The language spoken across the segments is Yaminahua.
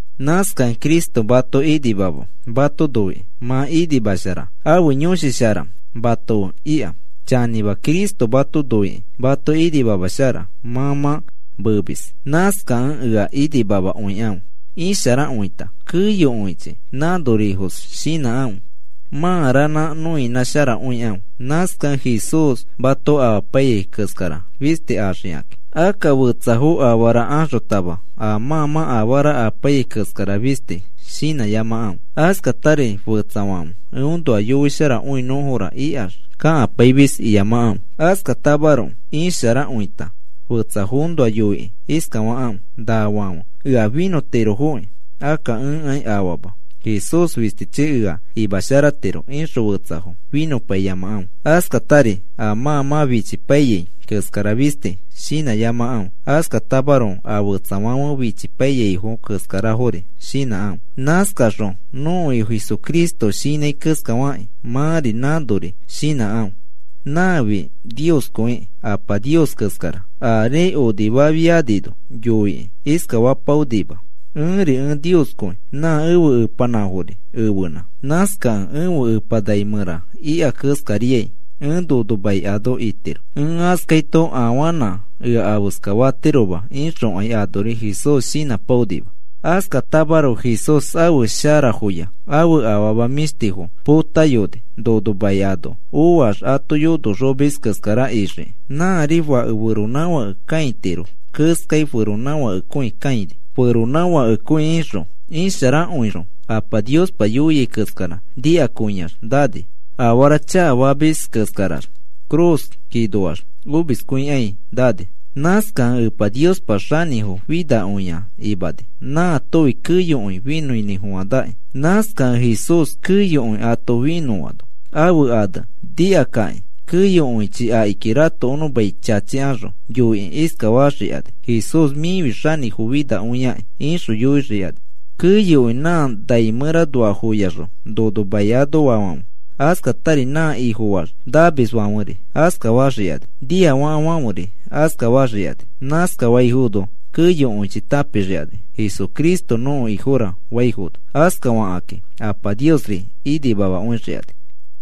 Nãskakẽ Cristo mato inimama mato noikĩ mato inimamashara ãfe Yõshi Shara mato fe ika. Chanĩma, Cristo mato noikĩ mato inimamashara mã mã meemis. Nãskakẽ ea inimamakõikãfe. Isharakõita keyokõichi nãnorifos shinãkãfe. Mã ranã nõinãsharakõikãfe. Nãskakẽ Jesús mato amapaiyai keskara fisti axikakĩ. Akka fetsafo afara axotama a mã mã afara apaiyai keskara fisti shinãyamakãfe, askatari fetsafãfe eõnoa yoisharakõinõfora ikax kakapaimis iyamakãfe. Askatamaroko isharakõita fetsafoõnoa yoikĩ iskafakãfe: “Nafãfe ea finõtirofoki. Akka ẽkai afama. Jesús fistichi ea imasharatiro,” ixõ fetsafo finõpaiyamakãfe. Askatari a mã mã fichipaiyai keskara fisti shinãyamakãfe, askatamaroko a fetsafãfe fichipaiyaifo keskarafori shinãkãfe. Nãskaxõ nõko Ifo Jesucristo shinãi keskafakĩ mãri nãnori shinãkãfe. Nãfi Nioskõikĩ Apa Nios keskara ari onifafianino yoikĩ iskafapaonima: “Ẽri ẽ Nioskõi nã ẽfe Epanãfori ẽfenã. Nãskakẽ ẽfe Epa nai mẽra ika keskariai ẽ nono mai ano itiro. Ẽ askaito afanã ea afeska fatiroma,” ixokai anori Jesús shinãpaonima. Askatamaroko Jesús ãfe sharafoya ãfe afama mĩshtifo potayoni, nono mai ano oax ato yonoxomis keskara ixiki. Nãri fake feronãfake kãitiro keskai, feronãfakekõi kãini. Feronãfakekõi ixõ isharakõixõ Apa Niospa yoiai keskara nikakõiax nani. Afara chakafamis keskarax ifi cruz ikakinoax omiskõikai nani. Nãskakẽ Epa Niospa xanĩfo finakõia imani, nãatofi keyokõi finõinĩfofanakĩ. Nãskakẽ Jesús keyokõi ato finõano ãfe ane nikakakĩ keyokõichi akiki ratokonõ mai chachikaxõ yoikĩ iskafaxikani: “Jesús, mĩfi xanĩfo finakõiakĩ,” ixõ yoixikani keyokõi nã nai mẽranoafoyaxõ nono mai anoafãfe. Askatari nã Ifofax namisfãferi askafaxikani, niafakafãferi askafaxikani. Nãskafaifono keyokõichi tãpixikani, “Jesucristo nõko Ifora,” faifono. Askafakãki Apa Niosri inimamakõixikani.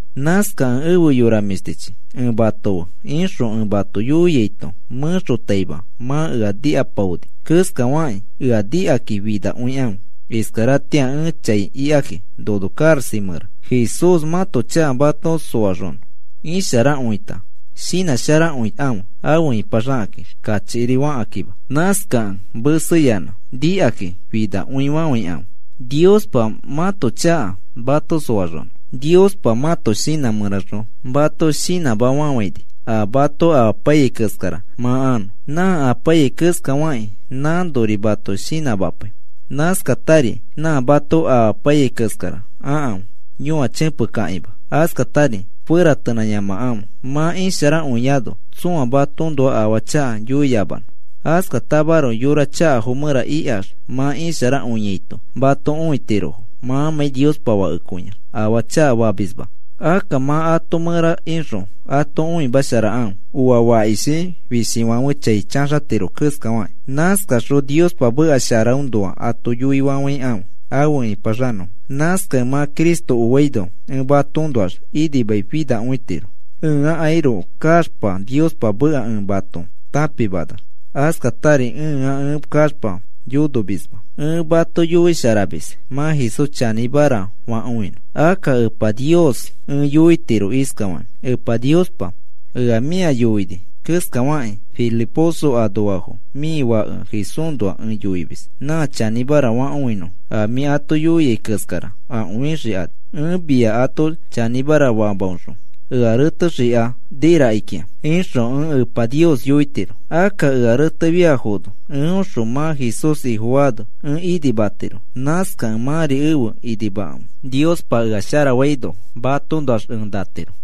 Nãskakẽ ẽfe yora mĩshtichi, ẽ mato fe ixõ ẽ mato yoiaito mẽxotaima mã ea nikapaoni keskafakĩ, ea nikakĩ finakõikãfe iskaratĩa ẽ chai ikakĩ nono karaxa mẽra. Jesús mãto chaka mato soaxonõ isharakõita shinãsharakõikãfe afe ĩpaxakakĩ kachikiri fakakĩma. Nãskakẽ meseyanã nikakĩ finakõifafãikãfe Niospa mãto chaka mato soaxonõ. Niospa mãto shinã mẽraxõ mato shinãmafafãini a mato amapaiyai keskara mã anõ. Nã apaiyai keskafakĩ, nãnori mato shinãmapai. Nãskatari nã mato amapaiyai keskara akãfe, yõachẽpekakima, askatari feratenãyamakãfe, mã isharakõiano tsõa matoõnoa afaa chaka yoiyamanõ. Askatamaroko yora chakafo mẽra ikax mã isharakõiaito mato õitirofo mãmãi Niospa fakekõiax afaa chakafamisma. Akka mã ato mẽra ixõ ato õimasharakãfe, oa fakishi fishifãfe chai chaxatiro keskafakĩ. Nãskaxõ Niospa meka sharaõnoa ato yoifofãfofãikãfe afe ĩpaxanõfo. Nãskakẽ mã Cristo oaino ẽ matoõnoax inimaifinakõitiro, ẽakairoko kaxpa Niospa meka ẽ mato tãpimanax, askatari ẽa ẽ kaxpa yonomisma. Ẽ mato yoisharamis mã Jesús chanĩmara fakõinõ. Akka Epa Nios ẽ yoitiro iskafakĩ: “Epa Niospa, ea mĩa yoini keskafakĩ Filiposo anoafo mĩ Fake Jesúsnoa ẽ yoimis. Nã chanĩmara fakõinõfo, a mĩ ato yoiai keskara akõixikani. Ẽ mia ato chanĩmara famaõxõ ea retexikani rakikĩa,” ixõ ẽ Epa Nios yoitiro. Akka ea retefiafono eõxõ mã Jesús Ifofaano ẽ inimatiro. Nãskakẽ mãri efe inimakãfe Niospa ea sharafaino matoõnoax ẽ natiro.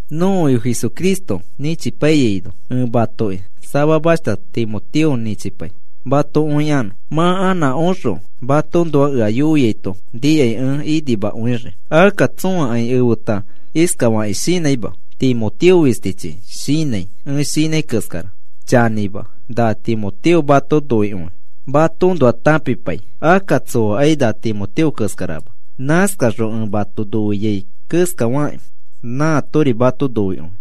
Nõko Ifo Jesucristo nĩchipaiyaino ẽ matoki samamashta Timoteo nĩchipai mato õikanõ. Mã anã oxõ matoõnoa ea yoiaito nikai ẽ inimakõixii. Akka tsõakai efeta iskafakĩ shinãima, Timoteo fistichi shinãi ẽ shinãi keskara. Chanĩma, na Timoteo mato noikõikĩ matoõnoa tãpipai mã Jesús Ifo sharafaamãki. Akka tsoakai na Timoteo keskarama. Nãskaxõ ẽ mato noiai keskafakĩ nãatori mato noikõi.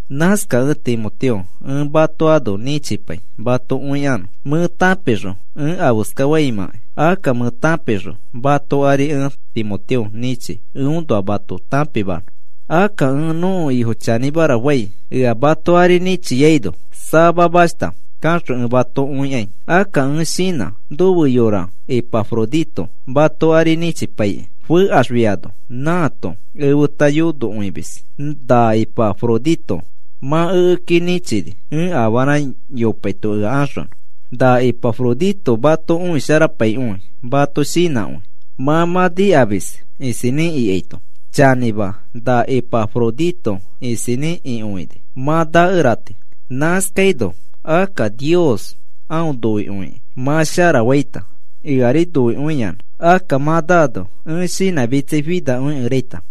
Nãskakẽ Timoteo, ẽ mato ano nĩchipai mato õikanõ. Mẽ tãpixõ ẽ afeskaimãkai, akka mẽ tãpixõ mato ari ẽ Timoteo nĩchi eõnoa mato tãpimanõ. Akka ẽ nõko Ifo chanĩmara fai, ea mato ari nĩchiaino samamashta kaxõ ẽ mato õikai. Akka ẽ shinã nofe yora Ipafrodito mato ari nĩchipaikĩ. Fekaxfiano nãato efeta yonokõimis na Ipafrodito mã ekeki nĩchini, ẽ afara yopaito ea axonõ. Na Ipafrodito mato õisharapaikõi, mato shinãkõi mãmãi nikamiskẽ isinĩ ikaito. Chanĩma, na Ipafrodito isinĩ ikõini, mã nakerati. Nãskaino akka Nios aõ noikõikĩ mã sharafaita, eari noikõiyanã. Akka mã naano ẽ shinãmitsaifinakõikeraita.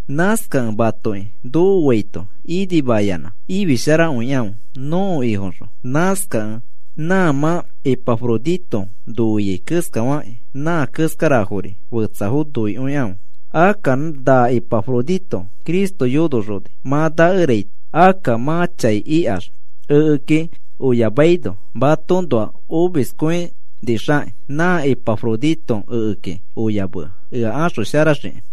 Nãskakẽ matoki nokoaito inimayanã ifisharakõikãfe nõko Ifoõxõ. Nãskakẽ nã mã Ipafrodito noiai keskafakĩ nã keskarafori fetsafo noikõikãfe. Akka na Ipafrodito Cristo yonoxoni mã nakeraita. Akka mã chai ikax ekeki oyamaino matoõnoa omiskõinixakĩ nã Ipafrodito ekeki oyamea ea axosharaxiki.